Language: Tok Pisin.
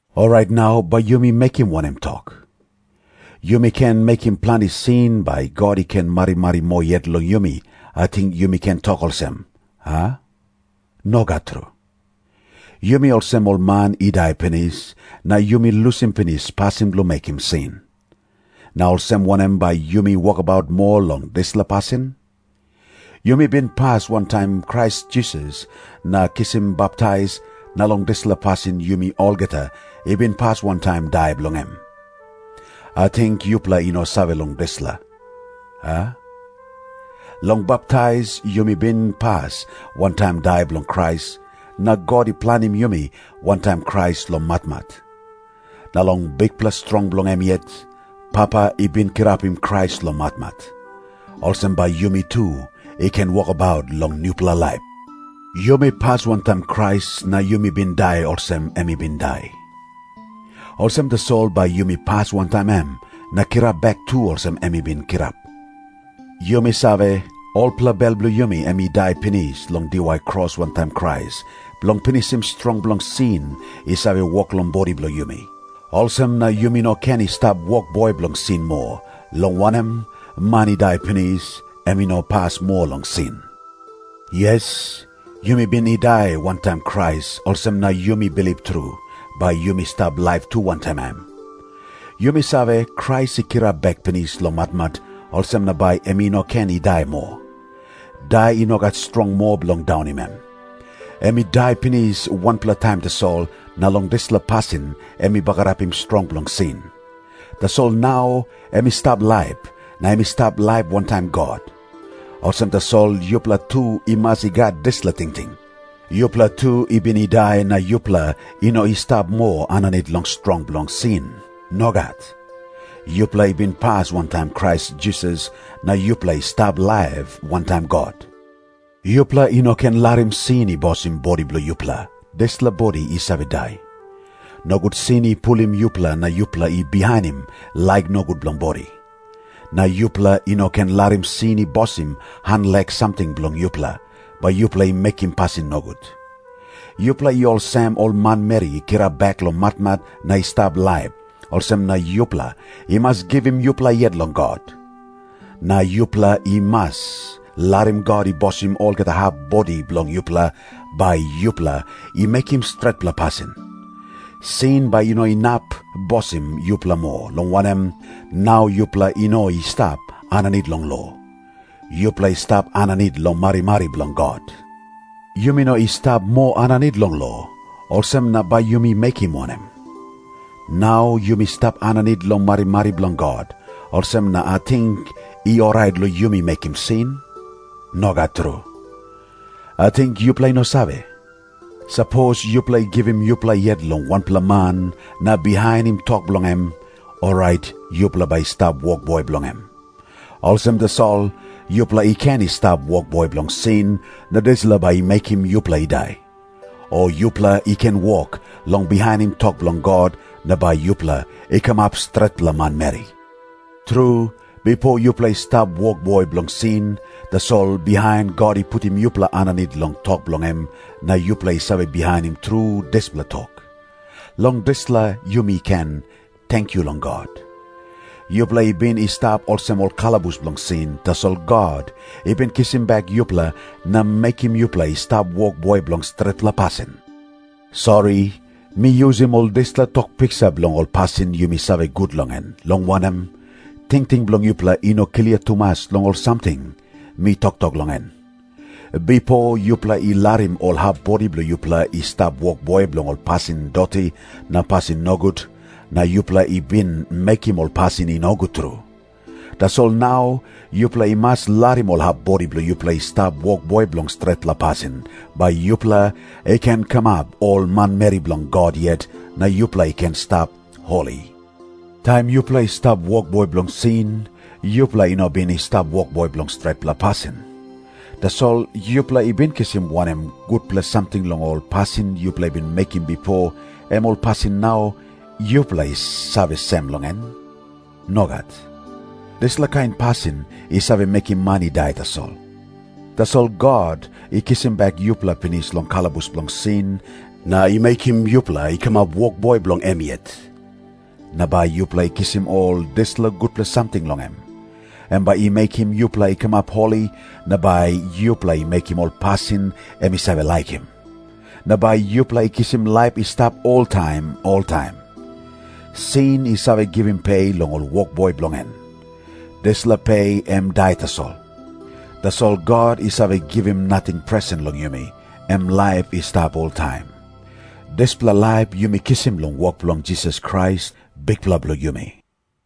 Orait nau bai yumi mekim wanem tok? "Yumi ken mekim planti sin bai God i ken marimari moa yet long yumi," ating yumi ken tok olsem, a? Nogat tru. Yumi olsem ol man i dai pinis, na yumi lusim pinis pasin bilong mekim sin. Na olsem wanem bai yumi wokabaut moa long dispela pasin? Yumi bin pas wantaim Krais Jisas na kisim baptais, na long dispela pasin yumi olgeta i bin pas wantaim dai bilong em. Ating yupela i no save long dispela, a? Long baptais yumi bin pas wantaim dai bilong Krais, na God i planim yumi wantaim Krais long matmat. Na long bikpela strong bilong em yet, Papa i bin kirapim Krais long matmat. Olsem bai yumi tu i ken wokabaut long nupela laip. Yumi pas wantaim Krais na yumi bin dai olsem em i bin i dai. Olsem tasol bai yumi pas wantaim em na kirap bek tu olsem em i bin kirap. Yumi save, olpela bel bilong yumi em i dai pinis long diwai kros wantaim Krais, bilong pinisim strong bilong sin i save wok long bodi bilong yumi. Olsem na yumi no ken i stap wokboi bilong sin moa, long wanem, man i dai pinis, em i no pas moa long sin. Yes, yumi bin i dai wantaim Krais, olsem na yumi bilip tru, bai yumi stap laip tu wantaim em. Yumi save, Krais i kirap bek pinis long matmat, olsem na bai em i no ken i dai moa. Dai i no gat strong moa bilong daunim em. Em i dai pinis wanpela taim tasol, na long dispela pasin em i bagarapim strong bilong sin. Tasol nau em i stap laip, na em i stap laip wantaim God. Olsem tasol yupela tu i mas i gat dispela tingting. Yupela tu i bin i dai na yupela i no i stap moa aninit long strong bilong sin. Nogat. Yupela i bin pas wantaim Krais Jisas na yupela i stap laip wantaim God. Yupela i no ken larim sin i bosim bodi bilong yupela, dispela bodi i save dai. Nogut sin i pulim yupela na yupela i bihainim laik nogut bilong bodi. Na yupela i no ken larim sin i bosim han lek samting bilong yupela, bai yupela i mekim pasin nogut. Yupela i olsem ol manmeri i kirap bek long matmat na i stap laip, olsem na yupela i mas givim yupela yet long God. Na yupela i mas larim God i bosim olgeta hap bodi bilong yupela, bai yupela i mekim stretpela pasin. Sin bai i no inap bosim yupela moa, long wanem, nau yupela i no i stap aninit long lo. Yupela i stap aninit long marimari bilong God. Yumi no i stap moa aninit long lo, olsem na bai yumi mekim wanem? Nau yumi stap aninit long marimari bilong God, olsem na ating i orait long yumi mekim sin? Nogat tru. Ating yupela i no save? Sapos yupela i givim yupela yet long wanpela man na bihainim tok bilong em, orait yupela bai i stap wokboi bilong em. Olsem tasol, yupela i ken i stap wokboi bilong sin, na dispela bai i mekim yupela i dai. O yupela i ken wok long bihainim tok bilong God na bai yupela i kamap stretpela manmeri. Tru, bipo yupela i stap wokboi bilong sin, tasol bihain God i putim yupela aninit long tok bilong em, na yupela i save bihainim tru dispela tok. Long dispela yumi ken tenkyu long God! Yupela i bin i stap olsem ol kalabus bilong sin, tasol God i bin kisim bek yupela na mekim yupela i stap wokboi bilong stretpela pasin. Sori, mi yusim ol dispela tok piksa bilong ol pasin yumi save gut long en, long wanem, tingting bilong yupela i no klia tumas long ol samting mi toktok long en. Bipo yupela i larim ol hap bodi bilong yupela i stap wokboi bilong ol pasin doti na pasin nogut, na yupela i bin mekim ol pasin i nogut tru. Tasol nau yupela i mas larim ol hap bodi bilong yupela i stap wokboi bilong stretpela pasin, bai yupela i ken kamap ol manmeri bilong God yet na yupela i ken i stap holi. Taim yupela i stap wokboi bilong sin, yupela i no bin i stap wokboi bilong stretpela pasin. Tasol yupela i bin kisim wanem gutpela samting long ol pasin yupela i bin mekim bipo, em ol pasin nau yupela i save sem long en? Nogat. Dispela kain pasin i save mekim man i dai tasol. Tasol God i kisim bek yupela pinis long kalabus bilong sin, na i mekim yupela i kamap wokboi bilong em yet. Na bai yupela i kisim ol dispela gutpela samting long em. Em bai i mekim yupela i kamap holi na bai yupela i mekim ol pasin em i save laikim. Na bai yupela i kisim laip i stap oltaim oltaim. Sin i save givim pe long ol wokboi bilong en. Dispela pe em dai tasol. Tasol God i save givim nating presen long yumi, em laip i stap oltaim. Dispela laip yumi kisim long wok bilong Jisas Krais, Bikpela bilong yumi.